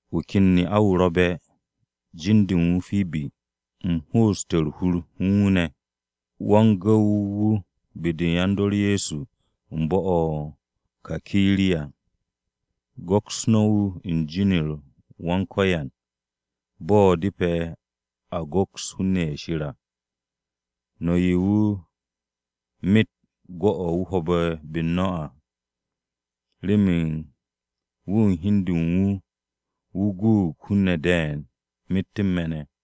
Wu̱ ken ne'a-wu̱ ro̱be̱, jin-de u̱n wu̱ Pibi. U̱m ho'oste̱ u̱r-hur u̱n wu̱ ne̱. Wa-m-se̱nge̱-wu̱ be-de u̱n yan-dor Ye̱so u̱n bo̱-o̱ o-Kakiriya. Go̱ks no̱ wu̱ u̱n jin-u̱r Wan-Ko̱yan, bo̱ depe̱ a go̱ks hun-ne̱ ye̱ Shir à. No̱ 'ye wu̱ myet gwu̱-o̱ wu̱ ho̱be̱ be-u̱r no̱ à, remen wu̱ u̱n hi u̱n de u̱n wu̱, wu̱ guug hun-ne̱ de̱e̱n myet u̱n me̱ ne̱.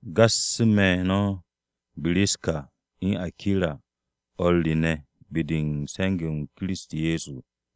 Gassu̱ me̱ no̱ Biskira u̱n Akira o̱r re ne̱ be-de u̱n se̱nge̱-m Kiristi Ye̱so.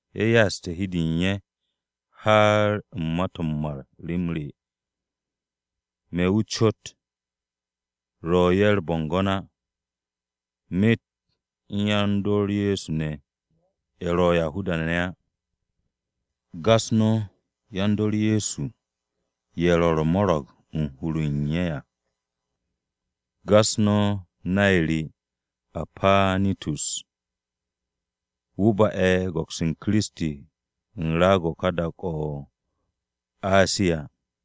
Ye̱ ya'aste̱ hi u̱n de u̱n ye̱, har u̱n ma-to̱ m-mar rem re. Me̱ wu̱ cot ro̱ ye̱ u̱r-bo̱ngo̱n á, myet u̱n yan-dor Ye̱so ne̱, ye̱ ro̱ Yahuda-ne̱ á. Gas no̱ yan-dor Ye̱so ye̱ ro̱ u̱r-mo̱ro̱g u̱n hur-o̱ u̱n ye̱ à. Gas no̱ nay re Apanitus, wu̱ ba'e̱ go̱ks u̱n Kiristi u̱n raag-o̱ u̱n dak-o̱ o-Asiya.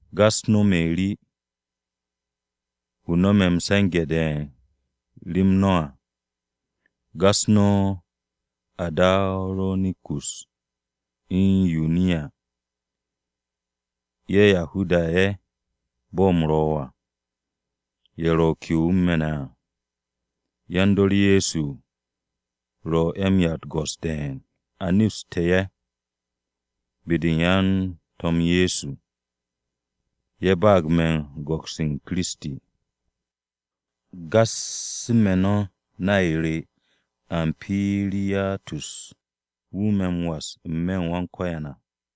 Gas no̱ Meri wu̱ no̱me̱ m-se̱nge̱ de̱e̱n rem no̱ à. Gas no̱ Andaronikus u̱n Yuniya, ye̱ Yahuda-ne̱ ye̱ bo̱ u̱m ro̱ à, ye̱ ro ke'o u̱n me̱ ne̱ à. Yan-dor Ye̱so ro̱ ye̱ m-'ya u̱t-go̱s de̱e̱n, a nepstu̱ ye̱ be-de u̱n yan-To̱m Ye̱so, ye̱ ba'ag me̱ go̱ks u̱n Kiristi. Gassu̱ me̱ no̱ nay re Ampiriyatus, wu̱ me̱ m-was n-me̱ u̱n Wan-Ko̱yan à.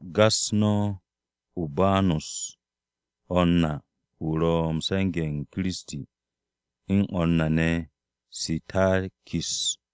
Gas no̱ Urbanus o̱r na wu̱ ro̱ u̱n se̱nge̱-m Kiristi à, u̱n o̱r re ne̱ Sitakis.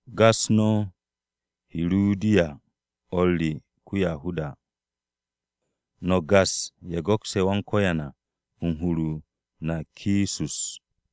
Gas no̱ Hirudiyan o̱r re ko-Yahuda. No̱ gas ye̱ go̱kse̱ Wan-Ko̱yan u̱n hur-o Narkisus à.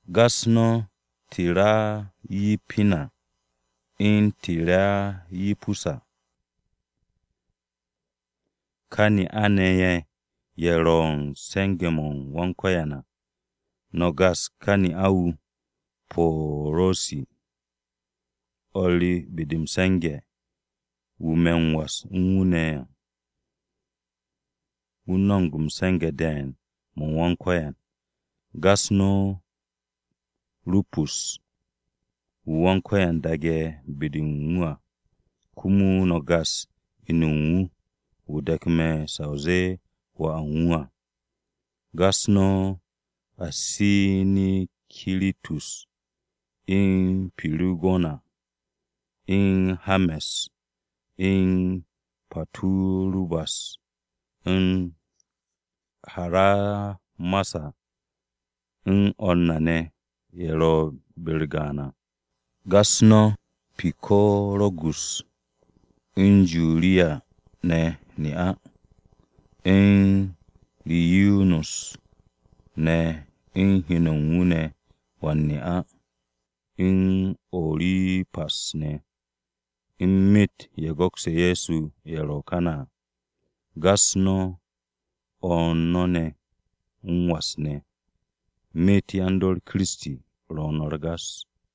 Gas no̱ Tirayipina u̱n Tirayipusa ne̱. Ka ne'a-ne̱ ye̱, ye̱ ro̱ u̱n se̱nge̱-m Wan-Ko̱yan à. No̱ gas ka ne'a-wu̱ Po̱ro̱si, o̱r re be-de m-se̱nge̱, wu̱ me̱ m-was u̱n wu̱ ne̱ à. Wu̱ no̱mo̱g m-se̱nge̱ de̱e̱n mo̱ u̱n Wan-Ko̱yan. Gas no̱ Rupus, wu̱ Wan-Ko̱yan daage̱ be-de u̱n wu̱ à. Komo no̱ gas inu u̱n wu̱, wu̱ de̱ku̱ me̱ sa o zee wà u̱n wu̱ à. Gas no̱ Asinikiritus, u̱n Pirigona, u̱n He̱rme̱s, u̱n Paturubas, u̱n Haramasa u̱n o̱r u̱n na ne̱ ye̱ ro̱ be-u̱r gaan à. Gas no̱ Pikorogus, u̱n Juriya ne̱ ne'a, u̱n Niriyus ne̱ u̱n heno u̱n wu̱ ne̱ wan-ne'a, u̱n Orimpas ne̱ u̱n myet o̱ u̱n ye̱ go̱kse̱ Ye̱so ne̱ ye̱ ro̱ kane̱ à. Gas no̱ o̱r no̱ ne̱ m-was ne̱. Myet yan-dor Kiristi ro̱ no̱ m-gas.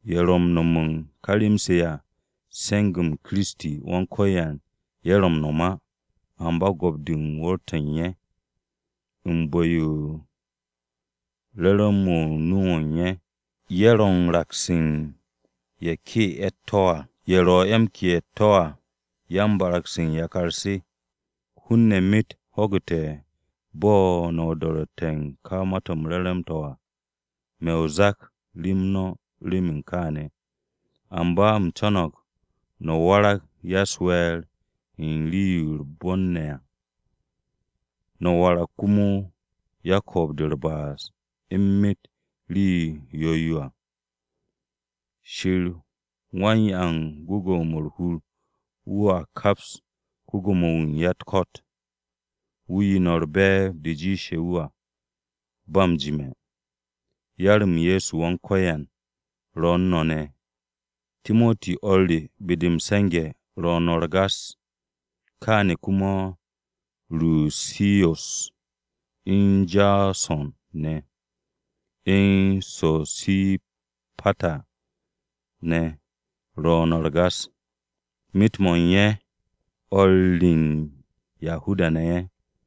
Ye̱ ro̱ m-no̱m u̱n ka rem-se à, se̱nge̱-m Kiristi Wan-Ko̱yan ye̱ ro̱ m-no̱m á, amba go̱p-de u̱n wu̱r-to̱ u̱n ye̱. U̱n bu̱-yo u̱n re̱re̱m-mo̱ nu-o̱ u̱n ye̱, u̱n bo̱ngo̱n-de u̱t-bo̱ ne̱, ye̱ ro̱ u̱n raks u̱n ye̱ ke'e̱ ye̱ u̱t-to̱ à. Ye̱ ro̱ ye̱ u̱n ke'e̱ u̱t-to̱ à, yan-barag-se u̱n yakar se. Hun-ne̱ myet ho̱gu̱te̱ bo̱ no̱ o-do̱ro̱tte̱ u̱n ka Ma-to̱ m-Re̱re̱m to̱ à. Me̱ o-zak rem no̱ remen kaane̱. Amba u̱m co̱no̱g no̱ warag ya-u̱s-we̱e̱r u̱n rii-yo ro̱ u̱r-bon ne̱ à. No̱ warag komo yan-ko̱o̱b-de u̱r-ba'as u̱n myet yo ro̱ rii yo̱-yo à. Shir wan-'ya u̱n gwu̱gwu̱-mo̱ u̱r-hur wu̱a kaps ko-Gwo̱mo-wu̱ u̱n ya-u̱t-ko̱t. Wu̱ 'ye no̱ u̱r-be̱e̱b de jiishe̱ wu̱ à, ba m-jime̱. Yar-m Ye̱so Wan-Ko̱yan ro̱ u̱n no̱ ne̱! Timoti o̱r re be-de m-se̱nge̱ ro̱ no̱ m-gas. Kaane̱ komo Rushiyos, u̱n Jaso̱n ne̱, u̱n Sosipata ne̱ ro̱ no̱ m-gas, myet-mo̱ u̱n ye̱ o̱r re u̱n Yahuda-ne̱ ye̱.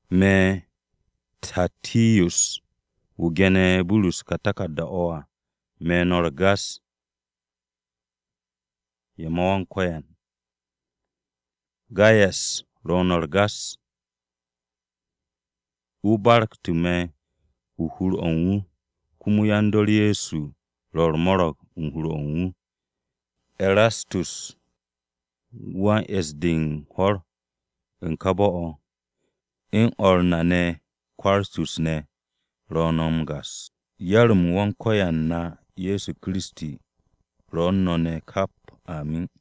Me̱ Te̱rtiyus, wu̱ gene̱ Burus ka taku̱rda-o̱ à, me̱ no̱ u̱r-gas ye̱ ma Wan-Ko̱yan. Gayas ro̱ no̱ m-gas. Wu̱ barku̱tu̱ me̱ u̱n hur-o̱ u̱n wu̱, komo yan-dor Ye̱so ro̱ u̱r-mo̱ro̱g u̱n hur-o̱ u̱n wu̱. Erastus, wan-e̱ss-de u̱n hwo̱r u̱n kà bo̱-o̱, u̱n o̱r na Kwartus ne̱ ro̱ no̱ m-gas. Yar-m Wan-Ko̱yan na Ye̱so Kiristi ro̱ u̱n no̱ ne̱ kap! Amin.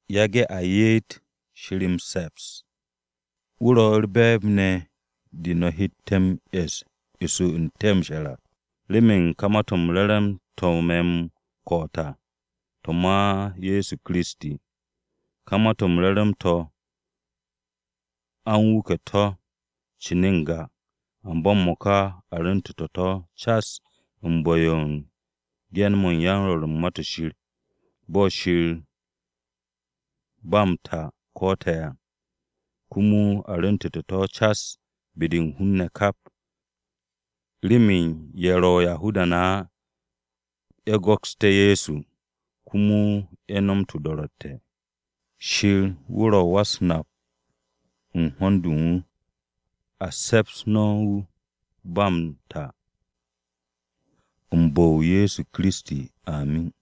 Yage̱ a ye'et Shir m-se̱ps! Wu̱ ro̱ u̱r-be̱e̱b ne̱ de no̱ hette̱ m-e̱s eso n-te̱ m-she̱r à, remen ka Ma-to̱ m-Re̱re̱m to̱ me̱ m-ko̱'o̱t à, to̱ ma Ye̱so Kiristi. Ka Ma-to̱ m-Re̱re̱m to̱ a u̱n wuke̱ to̱ cin n-ga. Amba m-mo̱ka a rwu̱ntu̱tu̱ to̱ cas u̱n bu̱-yo u̱n ge̱n-mo̱ u̱n yan-Rwo̱r u̱n Ma-to̱ Shir. Bo̱ Shir ba m-ta ko̱'o̱te̱ à, komo a rwu̱ntu̱tu̱ to̱ cas be-de u̱n hun-ne̱ kap, remen ye̱ ro̱ Yahuda-ne̱ á ye̱ go̱ksté̱ Ye̱so, komo ye̱ no̱m o-do̱ro̱tte̱. Shir wu̱ ro̱ wa-u̱s-nap-wu̱ u̱n ho̱n-de u̱n wu̱. A se̱ps no̱ wu̱ ba m-ta u̱n bu̱-o Ye̱so Kiristi! Amin.